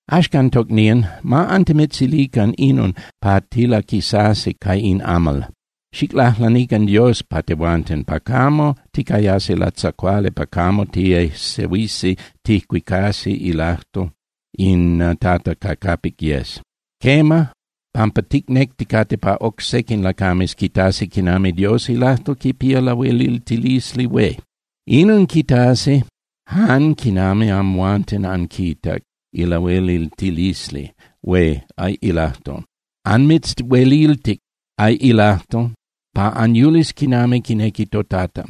Axcan, tocnían, ma antimitzilican inon pa tilaquisasi ca in amal. Xiclajlanican Dios pa tehuanten, pa camo ticayasi latzacuali pa camo tiejsehuisi ticuicasi ilajtol in Tata ca capic yes. Quema, pampa ticnecticate pa oc sequin lacames quitasi quinami Dios ilajtol quipía lahueliltilisli hué. Inon quitasi jan quinami amhuanten anquitac ilahueliltilisli hué ilajtol. Anmitzhueliltic ilajtol pa anyulis quinami quinequi toTata.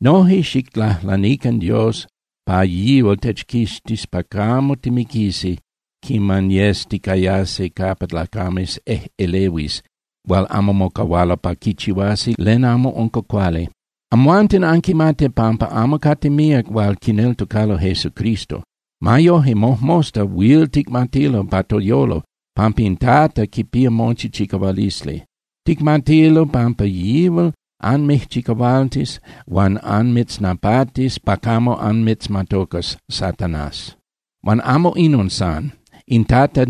Noje xiclajlanican Dios pa yihual techquixtis pa camo timiquisi quiman yes ticayasi capa lacames ejꞌelehuis hual amo mocahualo pa quichihuasi len amo unca cuali. Amhuanten anquimati pampa amo cate míac hual quineltocalo Jesucristo. Ma yoje, mojmosta huil ticmatilo pa toyolo pampa in Tata quipía mochi chicahualisli. Ticmatilo pampa yihual anmijchicahualtis huan anmitznapatis pa camo anmitzmatocas Satanás. Huan amo inon san. In Tata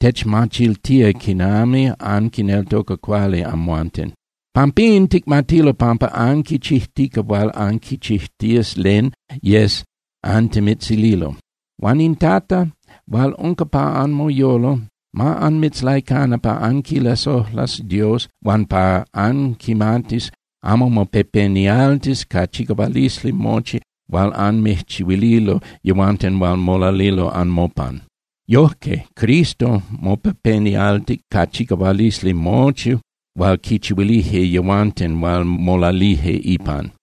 techmachiltía quinami anquineltoca cuali amhuanten. Pampín ticmatilo pampa anquichijtica huan anquichijtías len yes antimitzililo. Huan in Tata hual unca pa anmoyolo ma anmitzlaicana pa anquilasojlas Dios huan pa anquimatis anmopepenialtis ca chicahualisli mochi hual anmijchihuililo yehuanten hual molalilo anmopan. Yojque Cristo mopepenialtic ca chicahualisli mochi hual quichihuilije yehuanten hual molalije ipan.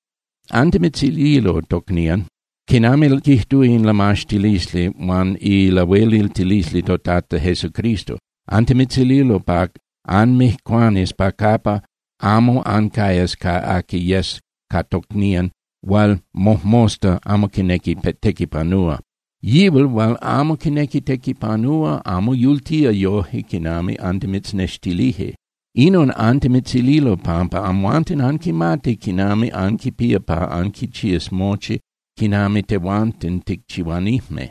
Antimitzililo, tocnían, quinami quijtúa in lamaxtilisli huan ilahueliltilisli toTata Jesucristo, antimitzililo pa anmijcuanis pa capa amo ancayas ca aqui yes ca tocnían hual mojmosta amo quinequi tequipanúa. Yihual hual amo quinequi tequipanúa amo yultica yoje quinami antimitznextilije. Inon antimitzililo pampa amhuanten anquimati quinami anquipía pa anquichías mochi quinami tehuanten ticchihuanijme.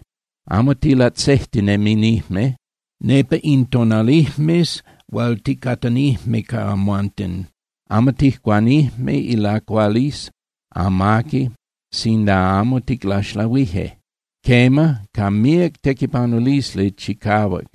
Amo tilatzejtineminijme nepa in tonalijmes hual ticatanijme ca amhuanten. Amo tijcuanijme ilacualisli amaqui sinda amo ticlaxlahuije. Quema, ca míac tequipanulisli chicahuac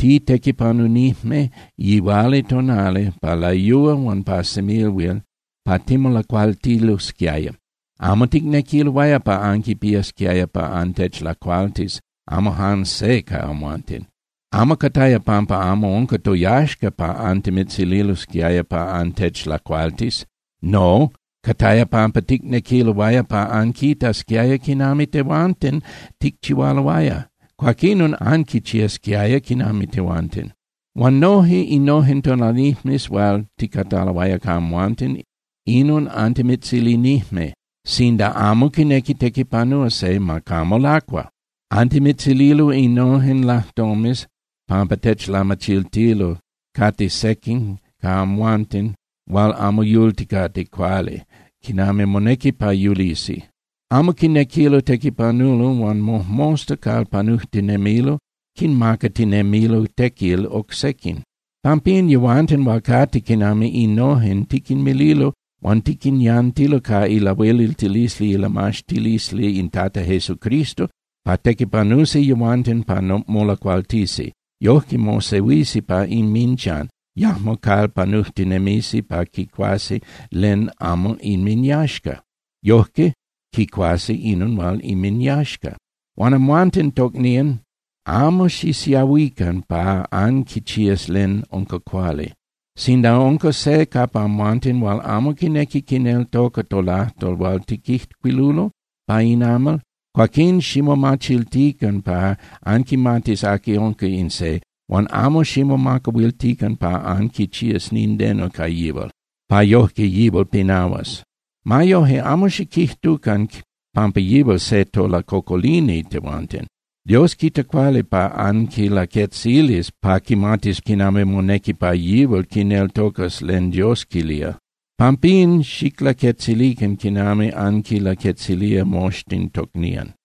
titequipanunijme yihualitonali pa layúa huan pa semilhuil pa timolacualtilosquiaya. Amo ticnequiloaya pa anquipiasquiaya pa antechlacualtis, amo jan se ca amhuanten. Amo cataya pampa amo unca toyaxca pa antimitzililosquiaya pa antechlacualtis. No, cataya pampa ticnequiloaya pa anquitasquiaya quinami tehuanten ticchihualoaya, cuaquinon anquichiasquiaya quinami tehuanten. Huan noje innojen tonalijmes hual ticataloaya ca amhuanten, inon antimitzilinijme: Sinda amo quinequi tequipanúa se, ma camo lacua. Antimitzililo innojen lajtomes pampa techlamachiltilo cate sequin ca amhuanten hual amo yulticate cuali quinami monequi pa yulisi. Amo quinequilo tequipanulo huan mojmosta calpanujtinemilo quinmacatinemilo tequil oc sequin. Pampín, yehuanten hual cate quinami innojen, tiquinmililo huan tiquinyantilo ca ilahueliltilisli ilamaxtilisli in Tata Jesucristo pa tequipanusi yehuanten pa molacualtisi. Yojque mosehuisi pa inminchan, yajmo calpanujtinemisi pa quicuasi len amo inminyaxca. Yojque quicuasi inon hual inminyaxca. Huan amhuanten, tocnían, amo xisiahuican pa anquichías len unca cuali. Sinda unca se capa amhuanten hual amo quinequi quineltoca tolajtol hual tiquijcuilulo pa in amal, cuaquín ximomachiltican pa anquimatis aqui unca in se, huan amo ximomacahuiltican pa anquichías nindeno ca yihual, pa yojque yihual pinahuas. Ma yoje, amo xiquijtucan pampa yihual se tolacocolini tehuanten. Dios quita cuali pa anquilaquetzilis pa quimatis quinami monequi pa yihual quineltocas len Dios quilía. Pampín, xiclaquetzilican quinami anquinlaquetzilía moxtin tocnían.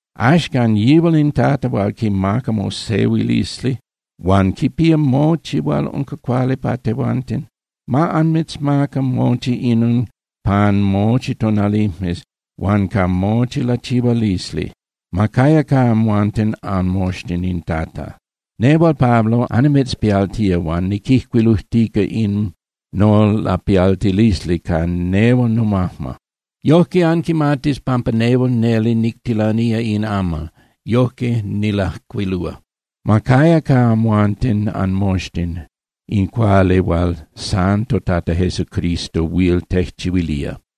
Axcan yihual in Tata hual quimaca mosehuilisli huan quipía mochi hual unca cuali pa tehuanten, ma anmitzmaca mochi inon pan mochi tonalijmes huan ca mochi lachihualisli. Ma caya ca amhuanten anmoxtin in Tata. Nehual Pablo annimitzpialtía, huan niquijcuilujtica in nolapialtilisli ca nehual nomajma. Yojque anquimatis pampa nehual neli nictilanía in amal, yojque nilajcuilúa. Ma caya ca amhuanten anmoxtin in cuali hual san toTata Jesucristo huil tejchihuilía.